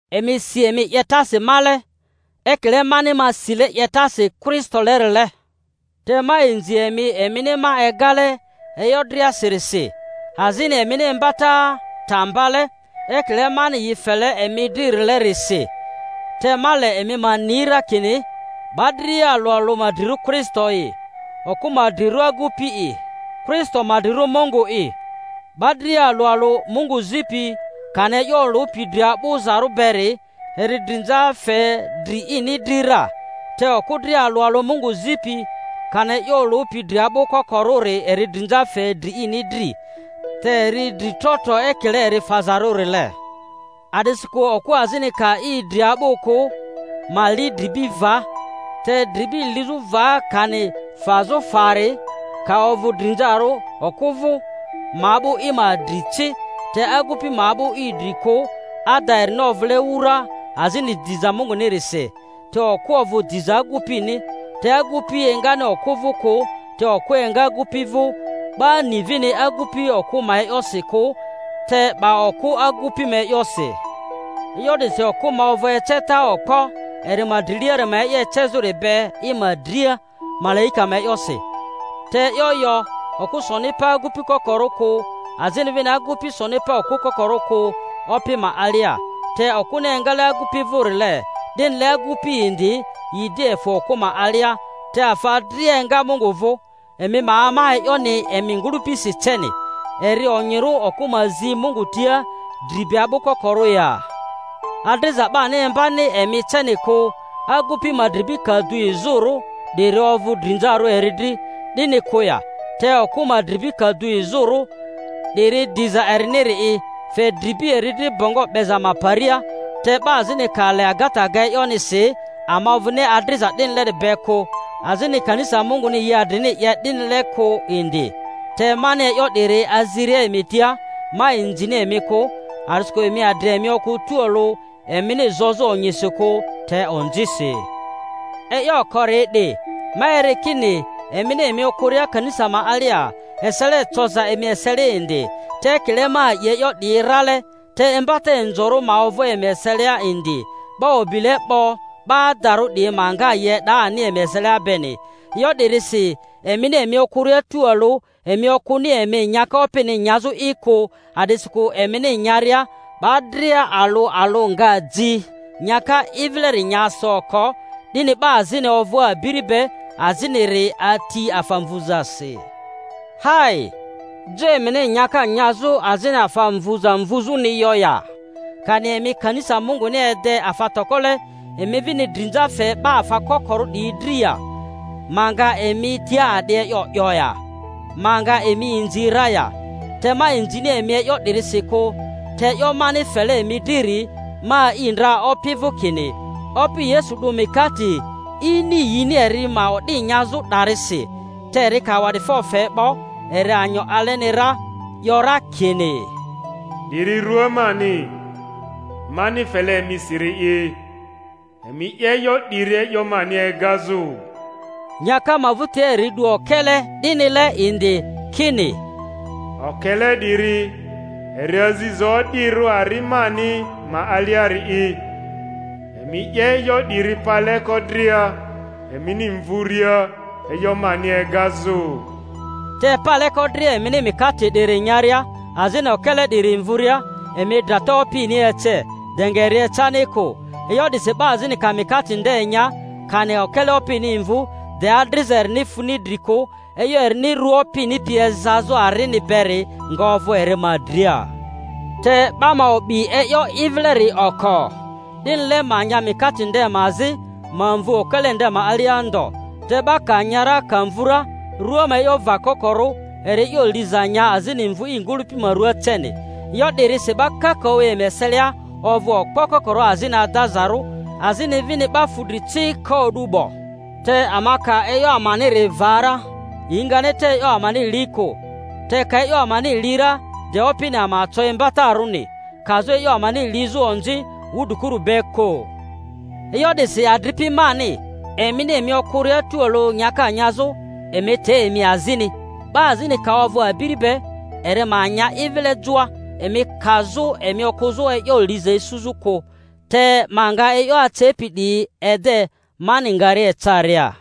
Emi si emi 'yetasi male, ekile mani ma sile 'yetasi Kristolerile. Te ma inzi emi emini ma egale e'yo driasirisi, azini emini imbata ta mbale ekile mani yi fele emi dririle-risi. Te ma le emi ma ni ra kini 'ba dria alᴜ alᴜ ma drirᴜ Kristo'i, okᴜ ma drirᴜ agupi'i, Kristo ma drirᴜ Mungu'i. 'Ba dria alᴜ alᴜ Mungu zipi kani e'yo olᴜpi dri a'bᴜzarᴜ beri eri drinza fe dri ini dri ra, te okᴜ dria alᴜ alᴜ Mungu zipi kani e'yo olᴜpi dri a'bᴜ kokorᴜri eri drinza fe dri ini dri—te eri dri tro tro ekile eri fazarᴜrile. A'disikᴜ okᴜ azini ka i dri a'bᴜ kᴜ, ma li i dribi va; te dribi lizᴜ va kani fazᴜ fari ka ovᴜ drinzarᴜ okᴜ vᴜ, ma a'bᴜ i ma dri ci. Te agupi ma a'bᴜ i dri kᴜ ada, erini ovᴜle wura azini diza Mungunirisi; te okᴜ ovᴜ diza agupini. (Te agupi engani okᴜ vᴜ kᴜ, te okᴜ enga agupi vᴜ. 'Ba-ni vini agupi okᴜ ma e'yosi kᴜ, te 'ba okᴜ agupi ma e'yosi.) E'yo 'disi okᴜ ma ovᴜ eceta okpo eri ma driliari ma e'yo ecezᴜri be i ma dria, malaika ma e'yosi. (Te e'yo yo, okᴜ soni pa agupi kokorᴜ kᴜ, azini vini agupi soni pa okᴜ kokorᴜ kᴜ, Opi ma alia; te okᴜni engale agupi vᴜrile, 'dinile agupi indi yi di efᴜ okᴜ ma alia. Te afa dria enga Mungu vᴜ.) Emi ma ama e'yoni emi ngᴜlᴜpisi ceni; eri onyirᴜ okᴜ ma zi Mungu tia dri be a'bᴜ kokorᴜ ya? Adriza 'bani imbani emi ceni kᴜ, agupi ma dribi ka du izᴜrᴜ, 'diri ovᴜ drinzarᴜ eri dri, 'dini kᴜ ya? Te okᴜ ma dribi ka du izᴜrᴜ, 'diri diza eriniri'i; fe dribi eri dri bongo 'beza ma paria. Te 'ba azini ka le agata ga e'yonisi, ama ovᴜni adriza 'dinileri be kᴜ, azini kanisa Munguni yi adrini 'ye 'dinile kᴜ indi. Te mani e'yo 'diri aziria emi tia, ma inzini emi kᴜ, a'disikᴜ emi adri emi okᴜ tualᴜ emini zozᴜ onyisi kᴜ, te onzisi. E'yo okori 'di, ma eri kini emini emi okᴜria kanisa ma alia, esele eoza emi eselia indi; te ekile ma a'i e'yo 'diyi rale. Te imbata inzorᴜ ma ovᴜ emi eselia indi, 'ba o'bile 'bo 'ba adarᴜ 'diyi ma nga yi e'da ani emi eselia beni. E'yo 'dirisi emini emi okᴜria tualᴜ, emi okᴜni emi nyaka Opini nyazᴜ'i kᴜ. A'disikᴜ emini nya-ria 'ba dria alᴜ alᴜ nga ji nyaka i vileri nya so oko, 'dini 'ba azini ovᴜ abiri be, aziniri ati afa mvuzasi. Hai! Jo emini nyaka nyazᴜ azini afa mvᴜza mvuzᴜni yo ya? Kani emi kanisa Munguni ede afa tokole, emi vini drinza fe 'ba afa kokorᴜ 'diyi dri ya? Ma nga emi tia a'di e'yo 'yo ya? Ma nga emi inzi ra ya? Te ma inzini emi e'yo 'dirisi kᴜ. Te e'yo mani fele emi driri, ma a'i ndra Opi vᴜ, kini, Opi Yesu 'du mikate ini yini eri ma o'di nyazᴜ 'darisi; te eri ka awa'difo fe 'bo, eri anyo aleni ra, 'yo ra kini, 'Diri rᴜa mani, mani fele emisiri'i. Emi 'ye e'yo 'diri e'yo mani egazᴜ. Nyaka ma vᴜtia eri 'du okele 'dinile indi, kini, Okele 'diri eri aziza o'dirᴜ ari mani ma aliari'i. Emi 'ye e'yo 'diri paleko dria emini mvuria, e'yo mani egazᴜ. Te paleko dria emini mikate 'diri nyaria, azini okele 'diri mvuria, emi drata Opini ece, de nga eri ecani kᴜ. E'yo 'disi 'ba azini ka mikate nde nya, kani ka okele Opini mvᴜ, de adriza erini funi dri kᴜ, e'yo erini rua Opini pi ezazᴜ arini beri nga ovᴜ eri ma dria. Te 'ba ma o'bi e'yo i vileri oko, 'dinile ma nya mikate nde ma azi, ma mvu okele nde ma alia ndo. Te 'ba ka nya ra, ka mvᴜ ra, rua ma e'yo vakokorᴜ, eri e'yo liza nya azini mvu i ngᴜlᴜpi ma ruaa ceni. E'yo 'dirisi 'ba kakaᴜ emi eselia ovᴜ okpo kokorᴜ, azini adaza-rᴜ, azini vini 'ba fudri ci ko o'du 'bo. Te ama ka e'yo amaniri va ra, yi ngani te e'yo amani li kᴜ. Te ka e'yo amani li ra de Opini ama co imbatarᴜni, kazᴜ e'yo amani lizᴜ onzi wudrikuru be kᴜ. E'yo 'disi, adripi mani, emini emi okᴜria tualᴜ nyaka nyazᴜ, emi te emi azini. 'Ba azini ka ovᴜ abiri be, eri ma nya i vile joa; emi kazᴜ emi okᴜzᴜ e'yo liza isuzᴜ'i kᴜ. Te ma nga e'yo acepi 'diyi ede mani ngaria ecaria.